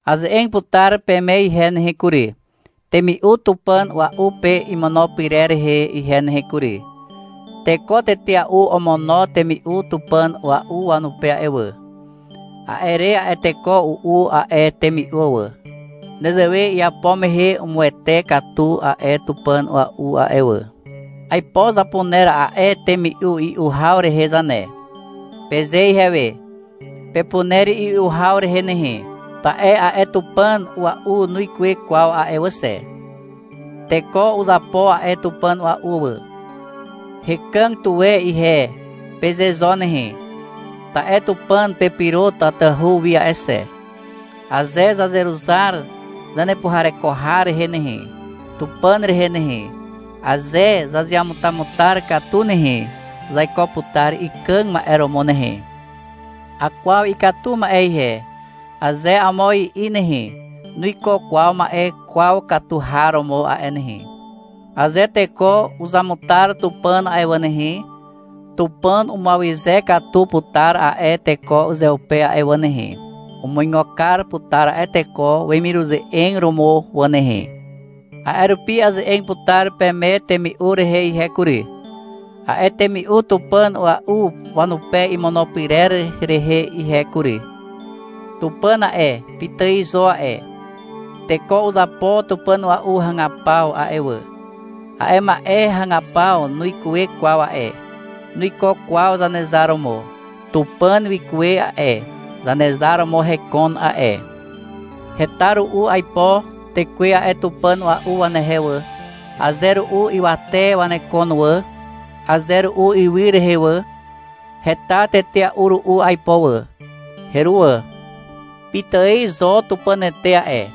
Aze'eg putar peme ihe nehe kury, temi'u tupàn a'ua'u pe imono pyrer rehe ihe nehe kury. Teko tetea'u omono temi'u tupàn a'ua'u wanupe a'e wà. A'e re a'e teko u'u a'e temi'u wà. Nezewe iapo mehe umuwete katu a'e tupàn a'ua'u a'e wà. — Aipo zapuner a'e temi'u i'u haw rehe zane, peze ihewe. Pepuner i'u haw rehe nehe, ta'e a'e tupàn a'ua'u nuikuwe kwaw a'e wà xe. Teko uzapo a'e tupàn a'ua'u wà. — Hekàg tuwe ihe, peze zo nehe. Ta'e Tupàn pepyro tatahu wi a'e xe. Aze zazeruzar zanepuhareko har rehe nehe, Tupàn rehe nehe, aze zazeamutamutar katu nehe, zaiko putar ikàg ma'e romo nehe. — Akwaw ikatu ma'e ihe, aze amo i'i nehe, nuiko kwaw ma'e kwaw katu har romo a'e nehe. Aze teko uzamutar Tupàn a'e wà nehe, Tupàn umuawyze katu putar a'e teko uzeupe a'e wà nehe. Umuigo kar putar a'e teko wemiruze'eg romo wà nehe. A'e rupi aze'eg putar peme temi'u rehe ihe kury, a'e temi'u tupàn a'ua'u wanupe imono pyrer rehe ihe kury. Tupàn a'e, pitài zo a'e. Teko uzapo tupàn a'ua'u hagapaw a'e wà. A'e ma'e hagapaw nuikuwe kwaw a'e. Nuiko kwaw Zanezar romo. Tupàn wikuwe a'e, Zanezar romo hekon a'e. Heta ru'u aipo tekwe a'e tupàn a'ua'u wanehe wà, aze ru'u ywate wanekon wà, aze ru'u ywy rehe wà. Heta tetea'u ru'u aipo wà. Heruwà. Pitài zo Tupànete a'e.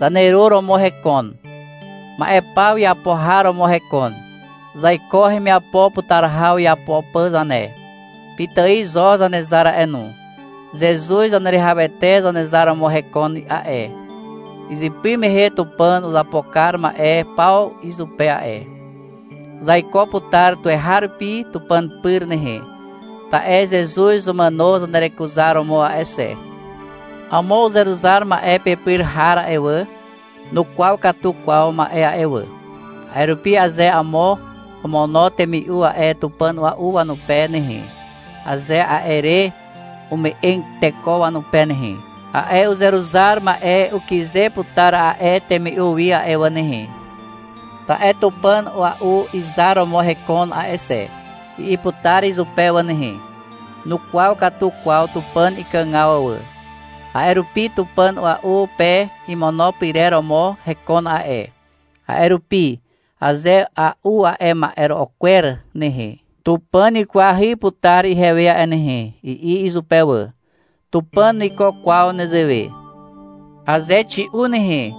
Zaneru romo hekon. Ma'e paw iapo har romo hekon. Zaiko hemiapo putar haw iapo pà zane. Pitài zo Zanezar a'e no. Zezuz Zaneruwihawete Zanezar romo hekon a'e. Izypy mehe Tupàn uzapo kar ma'e paw izupe a'e. Zaiko putar tuweharupi Tupàn pyr nehe, ta'e Zezuz umàno zanerekuzaromo a'e xe. Amo uzeruzar ma'e pepyr har a'e wà, nukwaw katu kwaw ma'e a'e wà. A'e rupi aze amo omono temi'u a'e tupàn a'ua'u wanupe nehe, aze a'e re ume'eg teko wanupe nehe, a'e uzeruzar ma'e ukyze putar a'e temi'u wi a'e wà nehe. Ta'e — Tupàn a'ua'u izar romo hekon a'e xe, i'i putar izupe wà nehe. Nukwaw katu kwaw Tupàn ikàgaw wà. A'e rupi — Tupàn a'ua'u pe imono pyrer romo hekon a'e, a'e rupi, aze a'u a'e ma'ero'o kwer nehe, Tupàn wikwahy putar ihewe a'e nehe, i'i izupe wà. Tupàn nuiko kwaw nezewe. Aze xi'u nehe,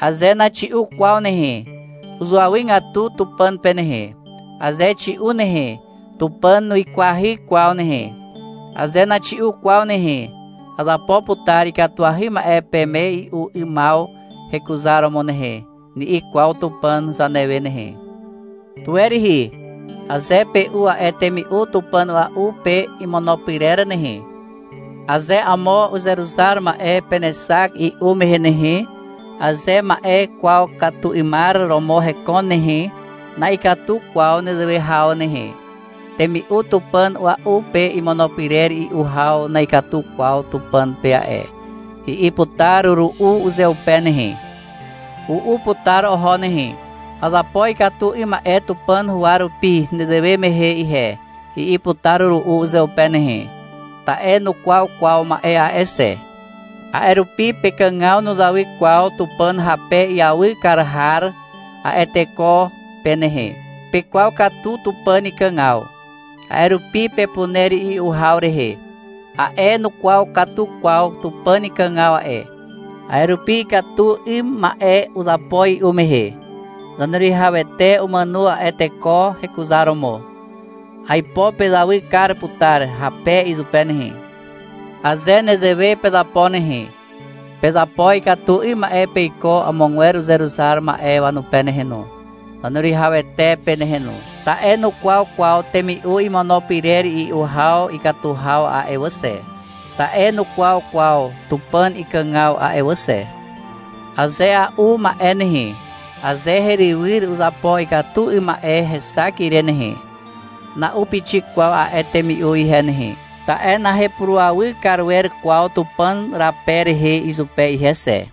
aze naxi'u kwaw nehe, uzuawygatu Tupàn pe nehe. Aze xi'u nehe, Tupàn nuikwahy kwaw nehe. Aze naxi'u kwaw nehe, — Azapo putar ikatuahy ma'e peme i'u 'ymaw hekuzaromo nehe, ni'i kwaw Tupàn zanewe nehe. Tuwe rihi, aze pe'u a'e temi'u tupàn a'ua'u pe imono pyrer nehe, aze amo uzeruzar ma'e penexak i'u mehe nehe, aze ma'e kwaw katu 'ymar romo hekon nehe, na'ikatu kwaw nezewe haw nehe, — Temi'u tupàn a'ua'u pe imono pyrer i'u haw na'ikatu kwaw Tupàn pe a'e, i'i putar ru'u uzeupe nehe. U'u putar oho nehe. — Azapo ikatu 'ym ma'e Tupàn huwa rupi nezewe mehe ihe, i'i putar ru'u uzeupe nehe. Ta'e nukwaw kwaw ma'e a'e xe. A'e rupi pekàgaw nuzawy kwaw Tupàn hape iawy kar har a'e teko pe nehe. Pekwaw katu Tupàn ikàgaw. A'e rupi pepuner i'u haw rehe. A'e nukwaw katu kwaw Tupàn ikàgaw a'e, a'e rupi ikatu 'ym ma'e uzapo i'u mehe. Zaneruwihawete umàno a'e teko hekuzaromo. Aipo pezawy kar putar hape izupe nehe. Aze nezewe pezapo nehe, pezapo ikatu 'ym ma'e peiko amogwer uzeruzar ma'e wanupe nehe no, Zaneruwihawete pe nehe no, ta'e nukwaw kwaw temi'u imono pyrer i'u haw ikatu haw a'e wà xe. Ta'e nukwaw kwaw Tupàn ikàgaw a'e wà xe. — Aze a'u ma'e nehe, aze herywyr uzapo ikatu 'ym ma'e hexak ire nehe, na'u pixik kwaw a'e temi'u ihe nehe. Ta'e nahepurawy kar wer kwaw Tupàn hape rehe izupe ihe xe.